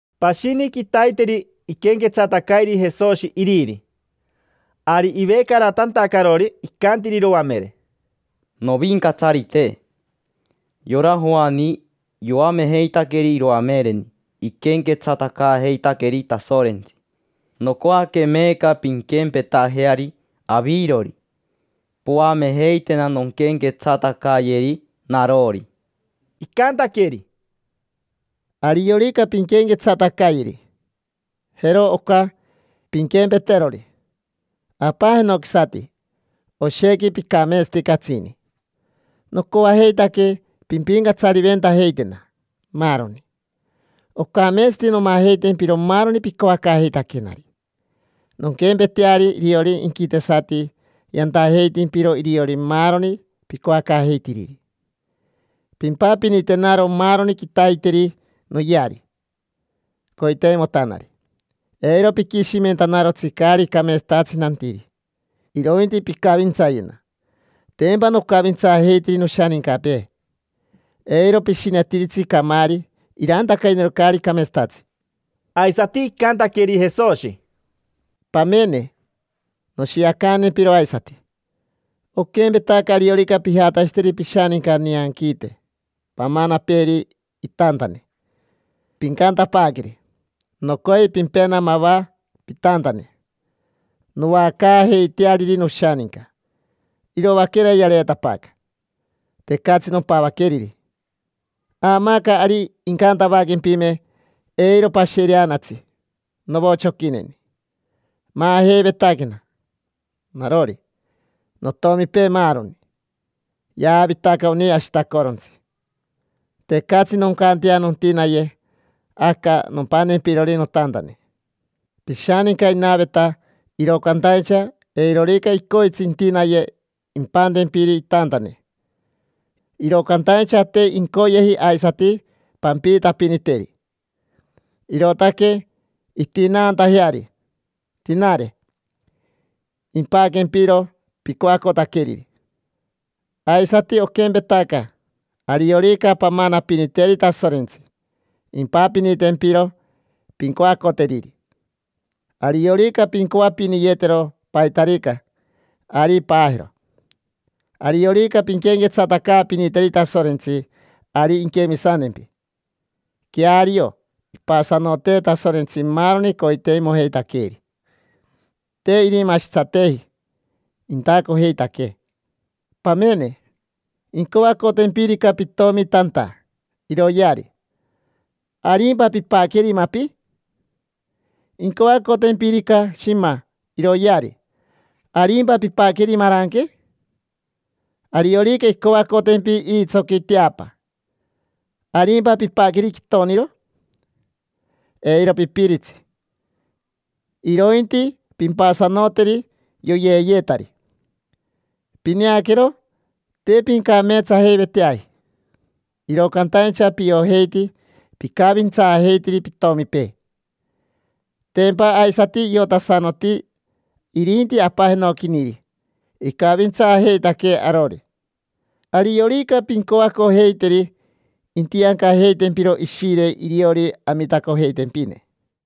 Pashini quitaiteri iquenquetsatacairi Jesoshi iriri. Ari ivecaratantacarori, icantiri iroamere: —Novincatsarite, yora Joani yoamejeitaqueri iroamereni iquenquetsatacaajeitaqueri Tasorentsi. Nocoaque meeca pinquempetajeari avirori: poamejeitena nonquenquetsatacayeri narori. Icantaqueri: —Ariorica pinquenquetsatacayeri, jero oca, pinquempeterori: Apa jenoquisati, oshequi picameetsati catsini, nocoajeitaque pimpincatsariventajeitena, maaroni. Ocameetsati nomajeitempiro maaroni picoacaajeitaquenari, nonquempeteari iriori inquitesati yantajeitimpiro iriori maaroni picoacaajeitiriri. Pimpapinitenaro maaroni quitaiteri noyeari coiteimotanari. Eiro piquishimentanarotsi caari cameetsatatsi nantiri, irointi picavintsayena: tempa nocavintsaajeitiri noshanincapee. Eiro pishinetiritsi camaari irantacayena caari cameetsatatsi. Aisati icantaqueri Jesoshi: —Pamene, noshiacantempiro aisati. Oquempetaca ariorica pijatashiteri pishaninca nianquiite pamanapeeri itantane. Pincantapaaqueri: “Nocoi pimpena mava pitantane noacaajeiteariri noshaninca. Iroaquera yareetapaaca, tecatsi nompavaqueriri”. Aamaaca ari incantavaquempime: “Eiro pashereanatsi, novochoquineni. Maajeivetaquena: narori, notomipee, maaroni. Yavitaca oni ashitacorontsi. Tecatsi noncantea nontinaye aca nompantempirori notantane”. Pishaninca inaveta, iro cantaincha eirorica icoitsi intinaye impantempiri itantane. Iro cantaincha te incoyeji aisati pampiitapiniteri, irootaque intinaantajeari, tinare, impaquempiro picoacotaqueriri. Aisati oquempetaca: ariorica pamanapiniteri Tasorentsi, impapinitempiro pincoacoteriri. Ariorica pincoapiniyetero paitarica, ari paajero. Ariorica pinquenquetsatacaapiniteri Tasorentsi, ari inquemisantempi. Queario, ipasanotee Tasorentsi maaroni coiteimojeitaqueeri: te irimashitsateji, intacojeitaquee. Pamene, incoacotempirica pitomi tanta iroyeari, ¿arimpa pimpaqueri mapi? Incoacotempirica shima iroyeari, ¿arimpa pimpaqueri maranque? Ariorica incoacotempi iitsoqui teapa, ¿arimpa pimpaqueri quitoniro? Eiro pipiritsi, irointi pimpasanoteri yoyeeyetari. Pineaquero, te pincameetsajeiveteaji, iro cantaincha piojeiti picavintsaajeitiri pitomipee. Tempa aisati iotasanoti irinti Apa jenoquiniri icavintsaajeitaquee arori. Ariorica pincoacojeiteri, intiancajeitempiro Ishire iriori amitacojeitempine.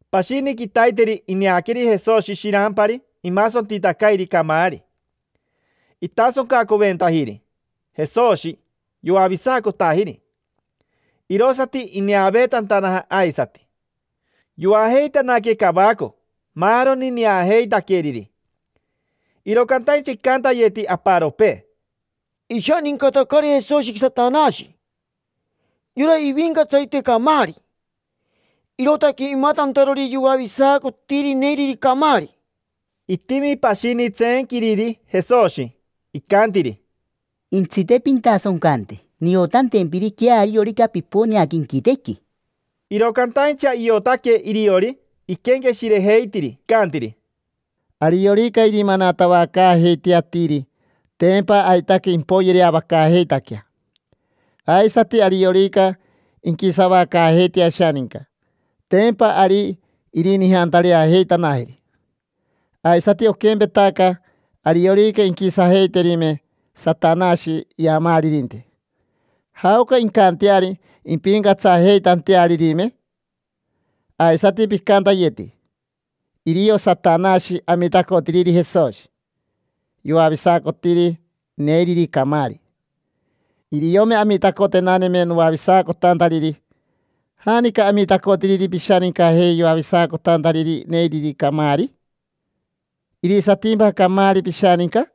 Pashini quitaiteri ineaqueri Jesoshi shirampari imasontitacairi camaari. Itasoncacoventajiri Jesoshi, yoavisacotajiri, irosati ineaveetantanaja aisati. Yoajeitanaque cavaco maaroni neajeitaqueriri. Iro cantaincha icantayeti aparopee: —Ishanincatacari Jesoshi Satanashi: yora ivincatsarite camaari, irootaque imatantarori yoavisacotiri neiriri camaari. Itimi pashini tseenquiriri Jesoshi, icantiri: —Intsite, pintasoncante, niotantempiri queariorica piponeaca inquitequi. Iro cantaincha iotaque iriori iquenqueshirejeitiri. Icantiri: —Ariorica irimanatavacaajeitea atiri, tempa aitaque impoyereavacaajeitaquea. Aisati ariorica inquisavacaajeitea ashaninca, tempa ari irinijantareajeitanajeri. Aisati oquempetaca, ariorica inquisajeiterime Satanashi iamaaririnte, ¿jaoca incanteari impincatsajeitantearirime? Aisati picantayeti: “Irio Satanashi amitacotiriri Jesoshi yoavisacotiri neiriri camaari”. Iriome amitacotenaneme noavisacotantariri, ¿janica amitacotiriri pishanicajei yoavisacotantariri neiriri camaari? ¿Irisatimpa camaari pishaninca?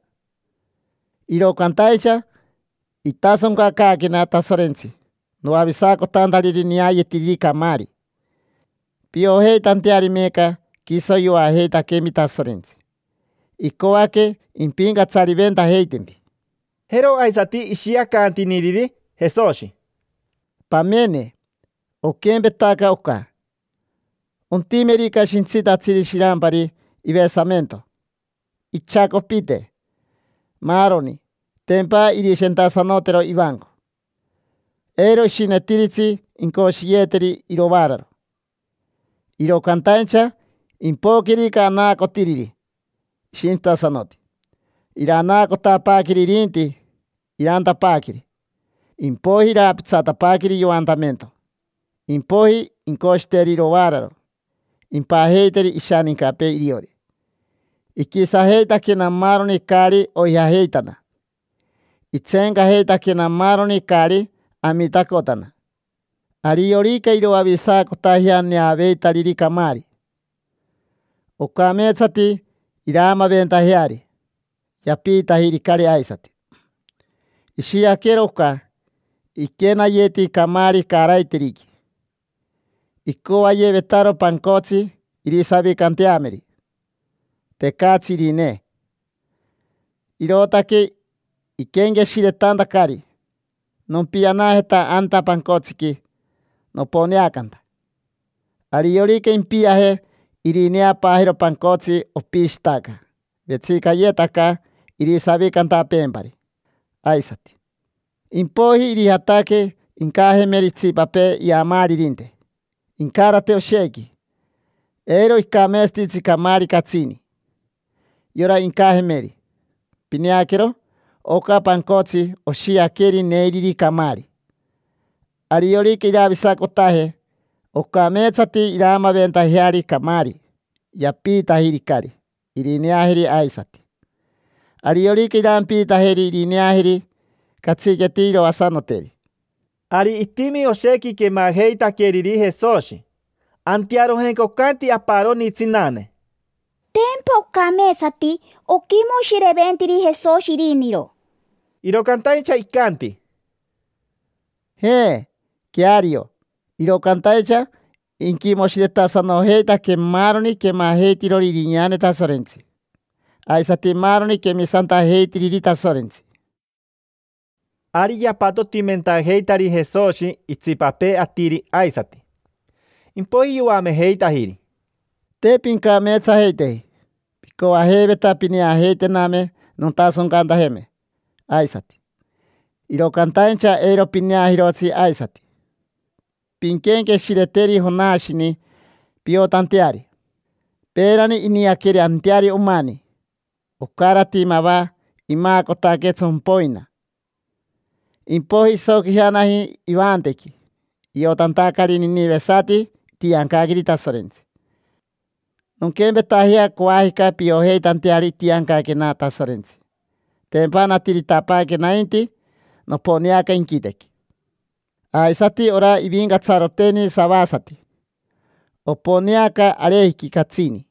Iro cantaincha itasoncacaaquena Tasorentsi noavisacotantariri neayetiriri camaari, piojeitanteari meeca quiso yoajeitaquempi Tasorentsi, icoaque impincatsariventajeitempi. Jero aisati ishiacantiniriri Jesoshi: —Pamene, oquempetaca oca: ontimerica shintsitatsiri shirampari ivesamento, ichacopite, maaroni, tempa irishentasanotero ivanco. Eiro ishinetiritsi incoshiyeeteri irovaararo. Iro cantaincha impoquerica anaacotiriri ishintsitasanoti, iranaacotapaaqueri irinti irantapaaqueri, impoiji iraapitsatapaaqueri yoantamento. Impoiji incoshiteri irovaararo, impajeiteri ishanincapee iriori. Iquisajeitaquena maaroni caari oijajeitana, itseencajeitaquena maaroni caari amitacotana. Ariorica iroavisacotajea neavetariri camaari, ocameetsati iraamaventajeari: yapiitajiricari aisati. Ishiaquero oca: iquenayeti camaari caaraiteriqui, icoayevetaro pancotsi irisavicanteameri. Tecatsi irinee, irootaque iquenqueshiretantacari: “Nompianajeta anta pancotsiqui noponeacanta”. Ariorica impiaje, irineapaajero pancotsi, opishitaca. Vetsicayetaca irisavicantapeempari aisati. Impoiji irijataque incajemeri itsipapee iyamaaririnte, incarate oshequi. Eiro icameetsatitsi camaari catsini, yora incajemeri. Pineaquero, oca pancotsi oshiaqueri neiriri camaari. Ariorica iravisacotaje, ocameetsati iraamaventajeari camaari: yapiitajiricari irineajeri aisati. Ariorica irampiitajeri irineajeri, catsiqueti iroasanoteri. Ari itimi oshequi quemajeitaqueriri Jesoshi. Antearojenca ocanti aparoni tsinane: —Tempa ocameetsati oquimoshireventiri Jesoshi iriniro. Iro cantaincha icanti: —Je, queario, iro cantaincha iquimoshiretasanojeitaque maaroni quemajeitirori irineane Tasorentsi, aisati maaroni quemisantajeitiriri Tasorentsi. Ari yapatotimentajeitari Jesoshi itsipapee atiri aisati. Impoiji yoamejeitajiri: —Te pincameetsajeiteji. Picoajeiveta pineajeitename nontasoncantajeme aisati, iro cantaincha eiro pineajirotsi aisati. Pinquenqueshireteri Jonashini piotanteari: peerani iniaqueri anteari omani. Ocarati mava imaacotaque tsompoina, impoiji isoquijanaji ivantequi, iotantacari ninivesati itiancaqueri Tasorentsi. Nonquempetajea coajica piojeitanteari itiancaquena Tasorentsi: tempa natiritapaaque nainti, noponeaca inquitequi. Aisati ora ivincatsaroteni savasati, oponeaca arejiqui catsini,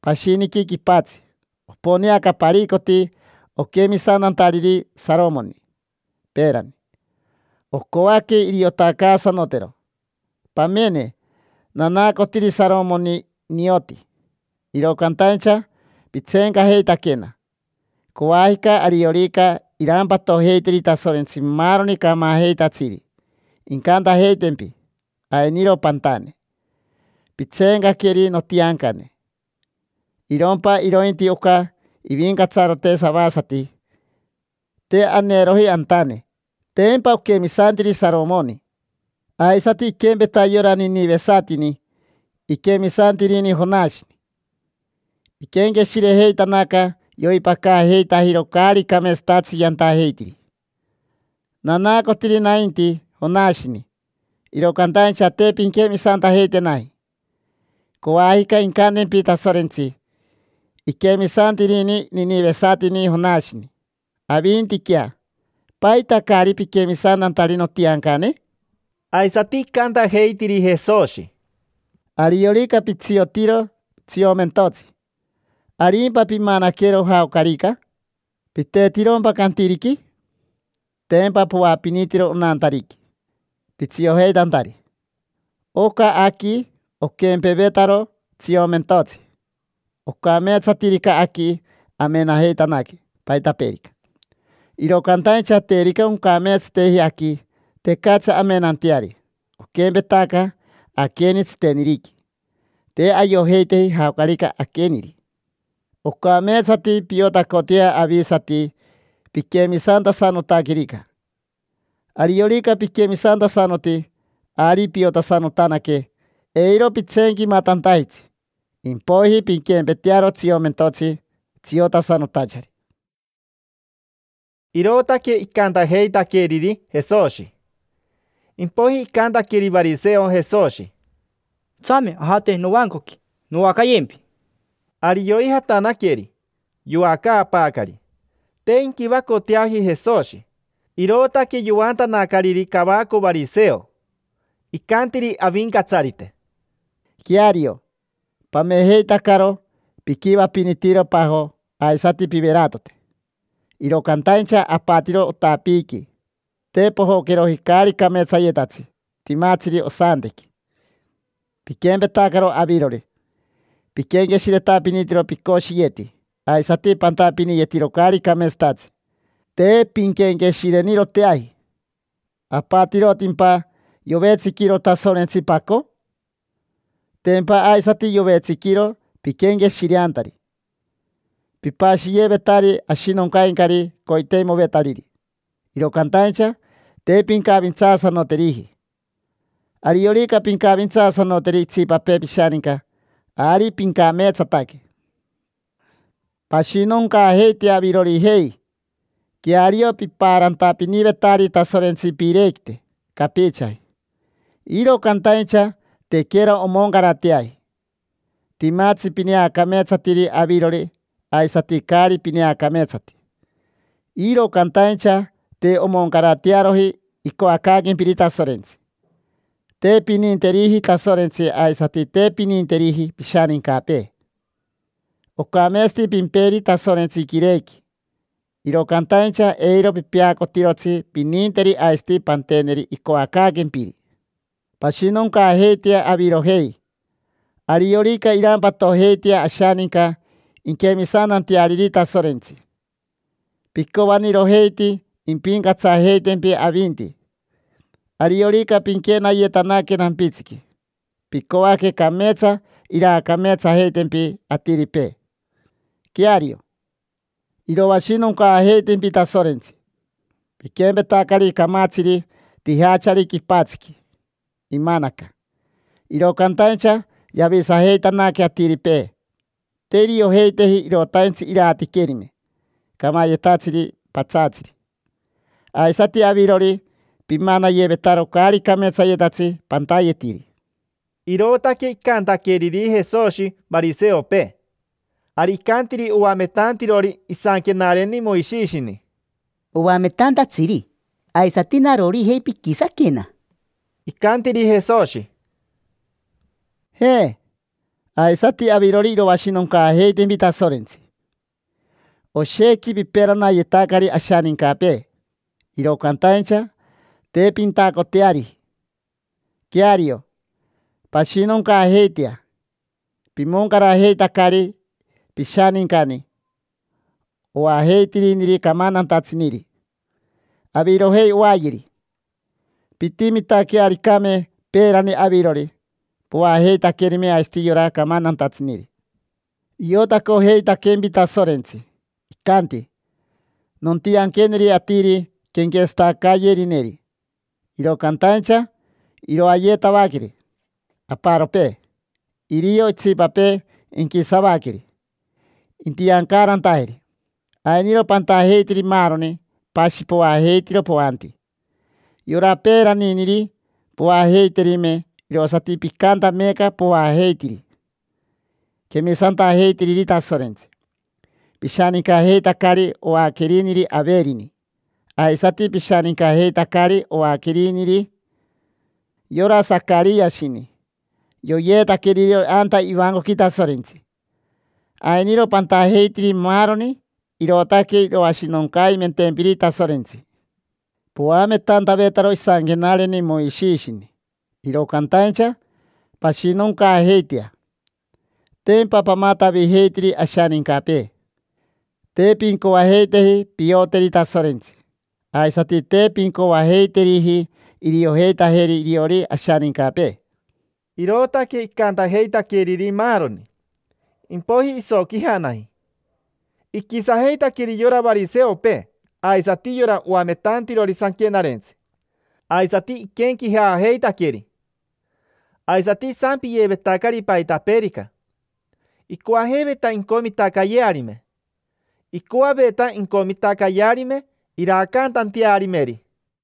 pashiniqui quipatsi. Oponeaca paricoti oquemisantantariri Saromoni, peerani. Ocoaque iriotacaasanotero. Pamene, nanaacotiri Saromoni nioti, iro cantaincha pitseencajeitaquena. Coajica, ariorica irampatojeiteri Tasorentsi maaroni camajeitatsiri, incantajeitempi: “Ainiro pantane: pitseencaqueri notiancane. Irompa irointi oca ivincatsarote savasati te aneeroji antane: tempa oquemisantiri Saromoni”. Aisati iquempeta yora ninivesatini: iquemisantirini Jonashini. Iquenqueshirejeitanaca, yoipacaajeitajiro caari cameetsatatsi yantajeitiri. Nanaacotiri nainti Jonashini, iro cantaincha te pinquemisantajeitenaji. Coajica incantempi Tasorentsi: “Iquemisantirini ninivesatini Jonashini: avintiquea, ¿paita caari piquemisantantari notiancane?” Aisati icantajeitiri Jesoshi: —Ariorica pitsiotiro tsiomentotsi, ¿arimpa pimanaquero jaocarica? ¿Pitetirompa cantiriqui? Tempa poapinitiro onantariqui, pitsiojeitantari. Oca aqui oquempevetaro tsiomentotsi. Ocameetsatirica aqui, amenajeitanaque paitapeerica. Iro cantaincha terica oncameetsateji aqui, tecatsi amenanteari, oquempetaca aqueni tsiteniriqui, te ayojeiteji jaocarica aqueniri. Ocameetsati piotacotea avisati piquemisantasanotaquerica. Ariorica piquemisantasanoti, ari piotasanotanaque, eiro pitseenquimatantajitsi. Impoiji pinquempetearo tsiomentotsi tsiotasanotachari. Irootaque icantajeitaqueriri Jesoshi. Impoiji icantaqueri variseo Jesoshi: —Tsame ajate novancoqui, noacayempi. Ari yoijatanaqueri, yoacaapaacari. Te inquivacoteaji Jesoshi, irootaque yoantanacariri cavaco variseo. Icantiri Avincatsarite: —Queario, pamejeitacaro piquivapinitiro pajo aisati piveratote: iro cantaincha apatiro otapiiqui. Te pojoqueroji caari cameetsayetatsi timatsiri osantequi. Piquempetacaro avirori: piquenqueshiretapinitiro picoshiyeti aisati pantapiniyetiro caari cameetsatatsi. Te pinquenqueshireniroteaji. ¿Apatirotimpa yovetsiquiro Tasorentsi paco? Tempa aisati yovetsiquiro piquenqueshireantari. Pipashiyevetari ashinoncaincari coiteimovetariri, iro cantaincha te pincavintsaasanoteriji. Ariorica pincavintsaasanoteri itsipapee pishaninca, ari pincameetsataque. Pashinoncaajeitea avirojei. Queario pipaarantapinivetari Tasorentsi piirequite capichaji, iro cantaincha tequera omoncarateaji. Timatsi pineacameetsatiri avirori aisati caari pineacameetsati. Iro cantaincha te omoncaratearoji icoacaaquempiri Tasorentsi. Te pininteriji Tasorentsi aisati te pininteriji pishanincapee. Ocameetsati pimperi Tasorentsi quirequi, iro cantaincha eiro pipeacotirotsi pininteri aisati panteneri icoacaaquempiri. Pashinoncaajeitea avirojei. Ariorica irampatojeitea ashaninca inquemisantanteariri Tasorentsi, picoanirojeiti impincatsajeitempi avinti. Ariorica pinquenayetanaque nampitsiqui, picoaque cameetsa iraacameetsajeitempi atiripee. Queario, iroashinoncaajeitempi Tasorentsi. Piquempetacari camatsiri tijachari quipatsiqui, imanaca; iro cantaincha yavisajeitanaque atiripee, te iriojeiteji irotaintsi iratiquerime camayetatsiri patsaatsiri. Aisati avirori, pimanayevetaro caari cameetsayetatsi pantayetiri. Irootaque icantaqueriri Jesoshi variseopee. Ari icantiri oamentantirori isanquenareni Moishishini: —Oametantatsiri, aisati narorijei piquisaquena. Icantiri Jesoshi: —Je, aisati avirori iroashinoncaajeitempi Tasorentsi. Oshequi piperanayetacari ashanincapee, iro cantaincha te pintacoteariji. Queario, pashinoncaajeitea. Pimoncarajeitacari pishanincani oajeitiriniri camantantatsiniri. Avirojei oayeri. Pintimitaquearicame peerani avirori, poajeitaquerime aisati yora camantantatsiniri. Iotacojeitaquempi Tasorentsi, icanti: “Nontianqueneri atiri quenquetsatacayerineri, iro cantaincha iroayetavaqueri aparopee, irio itsipapee inquisavaqueri, intiancaarantajeri”. Ainiro pantajeitiri maaroni: pashi poajeitiro poanti. Yora peeraniniri poajeiterime, irosati picanta meeca poajeitiri quemisantajeitiriri Tasorentsi. Pishanincajeitacari oaqueriniri Averini. Aisati pishanincajeitacari oaqueriniri yora Sacariashini: yoyeetaqueri iriori anta ivancoqui Tasorentsi. Ainiro pantajeitiri maaroni, irootaque iroashinoncaimentempiri Tasorentsi. Poametantavetaro isanquenareni Moishishini, iro cantaincha pashinoncaajeitea: tempa pamatavijeitiri ashanincapee. Te pincoajeiteji pioteri Tasorentsi, aisati te pincoacaajeiteriji iriojeitajeri iriori ashanincapee. Irootaque icantajeitaqueriri maaroni, impoiji isoquijanaji. Iquisajeitaqueri yora variseopee aisati yora oametantirori sanquenarentsi, aisati iquenquejaajeitaqueri. Aisati isampiyevetacari paitapeerica, icoajeiveta incomitacayearime. Icoaveta incomitacayearime iraacantantearimeri.